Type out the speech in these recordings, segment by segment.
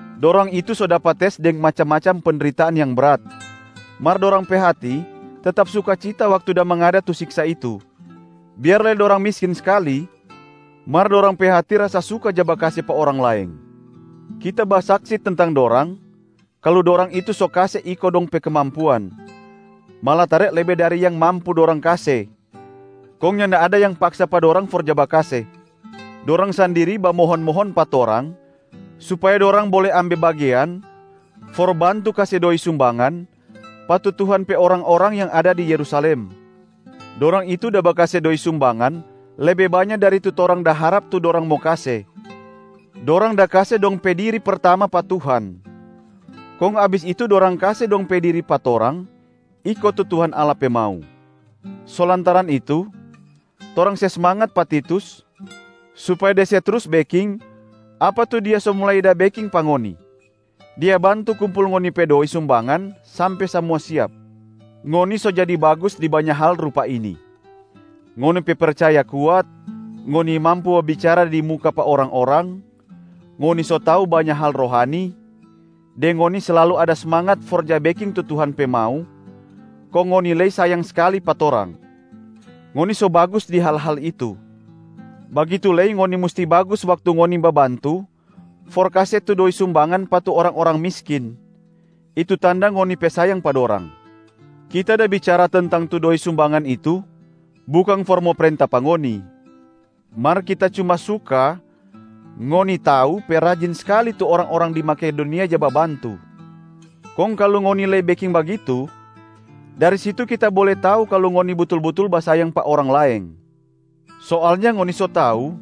Dorang itu so dapa tes deng macam-macam pendritaan yang brat, mar dorang pe hati tetap sukacita waktu da mangada tu siksa itu. Biar lei dorang miskin skali, mar dorang pe hati rasa suka ja bakase pa orang laeng. Kita basaksi tentang dorang kalu dorang itu so kase iko dong pe kemampuan, malatare lebe dari yang mampu dorang kase, kong nyanda ada yang paksa pa dorang for ja bakase. Dorang sandiri bamohon-mohon pa torang supaya dorang bole ambe bagean for bantu kase doi sumbangan pa tu Tuhan pe orang-orang yang ada di Yerusalem. Dorang itu da bakase doi sumbangan lebe banya dari tu torang da harap tu dorang mo kase, dorang da kase dong pe diri pertama pa Tuhan, kong abis itu dorang kase dong pe diri pa torang iko tu Tuhan Allah pe mau. So lantaran itu, torang se smangat pa Titus supaya dia se trus beking apa tu dia so mulai da beking pa ngoni, dia bantu kumpul ngoni pe doi sumbangan sampe samua siap. Ngoni so jadi bagus di banya hal rupa ini: ngoni pe percaya kuat, ngoni mampu babicara di muka pa orang-orang, ngoni so tau banya hal rohani, deng ngoni slalu ada smangat for ja beking tu Tuhan pe mau, kong ngoni lei sayang skali pa torang. Ngoni so bagus di hal-hal itu, bagitu lei ngoni musti bagus waktu ngoni babantu for kase tu doi sumbangan pa tu orang-orang miskin, itu tanda ngoni pe sayang pa dorang. Kita da bicara tentang tu doi sumbangan itu bukang for mo prenta pa ngoni, mar kita cuma suka ngoni tau pe rajin skali tu orang-orang di Makedonia ja babantu, kong kalu ngoni lei beking bagitu, dari situ kita bole tau kalu ngoni butul-butul basayang pa orang laeng. Soalnya ngoni so tau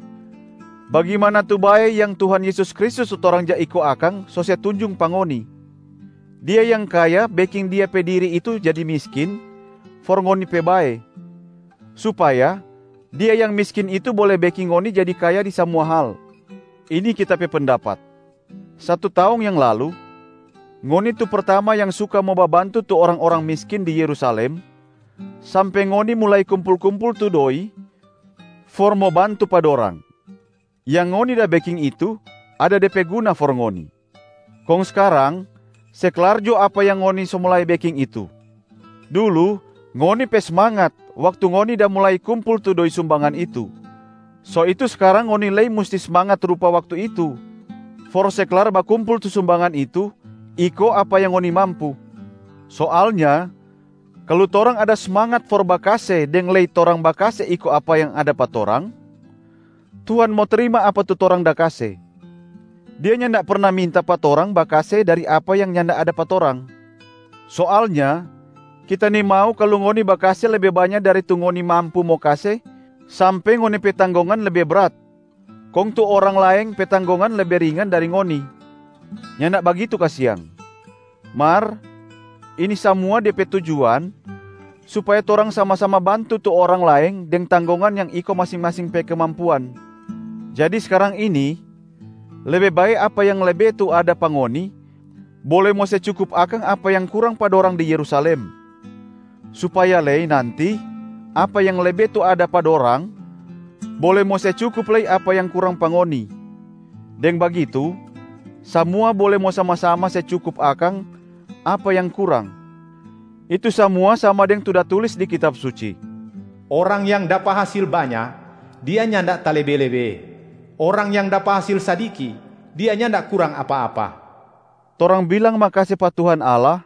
bagimana tu bae yang Tuhan Yesus Kristus tu torang ja iko akang so se tunjung pa ngoni. Dia yang kaya beking Dia pe diri itu jadi miskin for ngoni pe bae, supaya Dia yang miskin itu bole beking ngoni jadi kaya di samua hal. Ini kita pe pendapat: satu taong yang lalu, ngoni tu pertama yang suka mo babantu tu orang-orang miskin di Yerusalem sampe ngoni mulai kumpul-kumpul tu doi for mo bantu pa dorang. Yang ngoni da beking itu ada de pe guna for ngoni, kong skarang se klar jo apa yang ngoni so mulai beking itu. Dulu ngoni pe smangat waktu ngoni da mulai kumpul tu doi sumbangan itu, so itu skarang ngoni lei musti smangat rupa waktu itu for se klar bakumpul tu sumbangan itu, iko apa yang ngoni mampu. Soalnya kalu torang ada smangat for bakase deng lei torang bakase iko apa yang ada pa torang, Tuhan mo trima apa tu torang da kase. Dia nyanda perna minta pa torang bakase dari apa yang nyanda ada pa torang. Soalnya kita nimau kalu ngoni bakase lebe banya dari tu ngoni mampu mo kase sampe ngoni pe tanggongan lebe brat kong tu orang laeng pe tanggongan lebe ringan dari ngoni, nyanda bagitu kasiang. Mar ini samua de pe tujuan supaya torang sama-sama bantu tu orang laeng deng tanggongan yang iko masing-masing pe kemampuan. Jadi skarang ini, lebe bae apa yang lebe tu ada pa ngoni bole mo se cukup akang apa yang kurang pa dorang di Yerusalem, supaya lei nanti apa yang lebe tu ada pa dorang bole mo se cukup lei apa yang kurang pa ngoni, deng bagitu samua bole mo sama-sama se cukup akang apa yang kurang. Itu samua sama deng tu da tulis di Kitab Suci, “Orang yang dapa hasil banya, dia nyanda talebe-lebe. Orang yang dapa hasil sadiki, dia nyanda kurang apa-apa.” Torang bilang makase pa Tuhan Allah,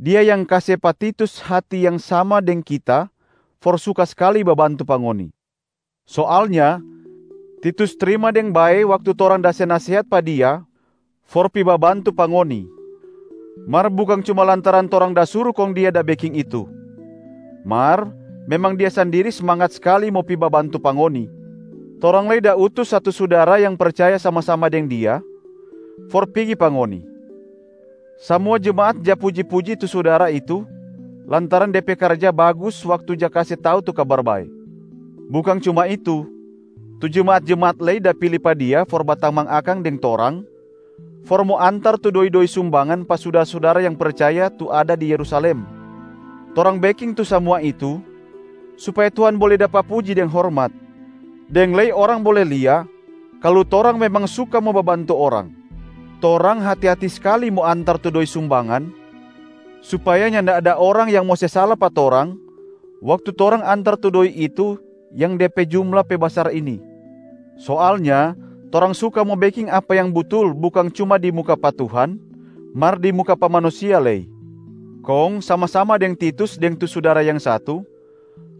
Dia yang kase pa Titus hati yang sama deng kita for suka skali babantu pa ngoni. Soalnya Titus trima deng bae waktu torang da se nasehat pa dia for pi babantu pa ngoni. Mar bukang cuma lantaran torang da suru kong dia da beking itu, mar memang dia sandiri smangat skali mo pi babantu pa ngoni. Torang lei da utus satu sudara yang percaya sama-sama deng dia for pigi pa ngoni. Samua jemaat ja puji-puji tu sudara itu lantaran de pe karja bagus waktu ja kase tau tu Kabar Bae. Bukang cuma itu, tu jemaat-jemaat lei da pili pa dia for batamang akang deng torang for mo antar tu doi-doi sumbangan pa sudara-sudara yang percaya tu ada di Yerusalem. Torang beking tu samua itu supaya Tuhan bole dapa puji deng hormat, deng lei orang bole lia kalu torang memang suka mo babantu orang. Torang hati-hati skali mo antar tu doi sumbangan supaya nyanda ada orang yang mo se sala pa torang waktu torang antar tu doi itu yang de pe jumla pe basar ini. Soalnya torang suka mo beking apa yang butul bukang cuma di muka pa Tuhan, mar di muka pa manusia lei. Kong sama-sama deng Titus deng tu sudara yang satu,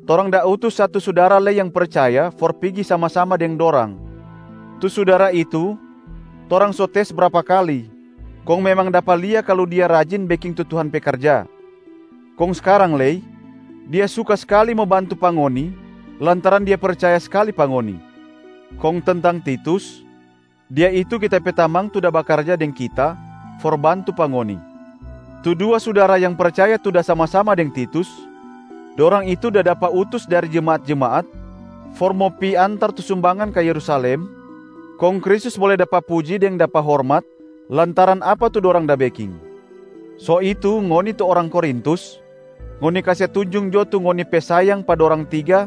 torang da utus satu sudara lei yang percaya for pigi sama-sama deng dorang. Tu sudara itu, torang so tes brapa kali, kong memang dapa lia kalu dia rajin beking tu Tuhan pe karja. Kong skarang lei, dia suka skali mo bantu pa ngoni lantaran dia percaya skali pa ngoni. Kong tentang Titus, dia itu kita pe tamang tu da bakarja deng kita for bantu pa ngoni. Tu dua sudara yang percaya tu da sama-sama deng Titus, dorang itu da dapa utus dari jemaat-jemaat for mo pi antar tu sumbangan ka Yerusalem, kong Kristus bole dapa puji deng dapa hormat lantaran apa tu dorang da beking. So itu, ngoni tu orang Korintus, ngoni kase tunjung jo tu ngoni pe sayang pa dorang tiga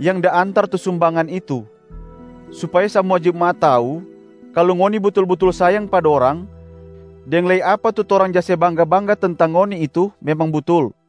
yang da antar tu sumbangan itu, supaya samua jemaat tau kalu ngoni butul-butul sayang pa dorang deng lei apa tu torang ja se bangga-bangga tentang ngoni itu memang butul.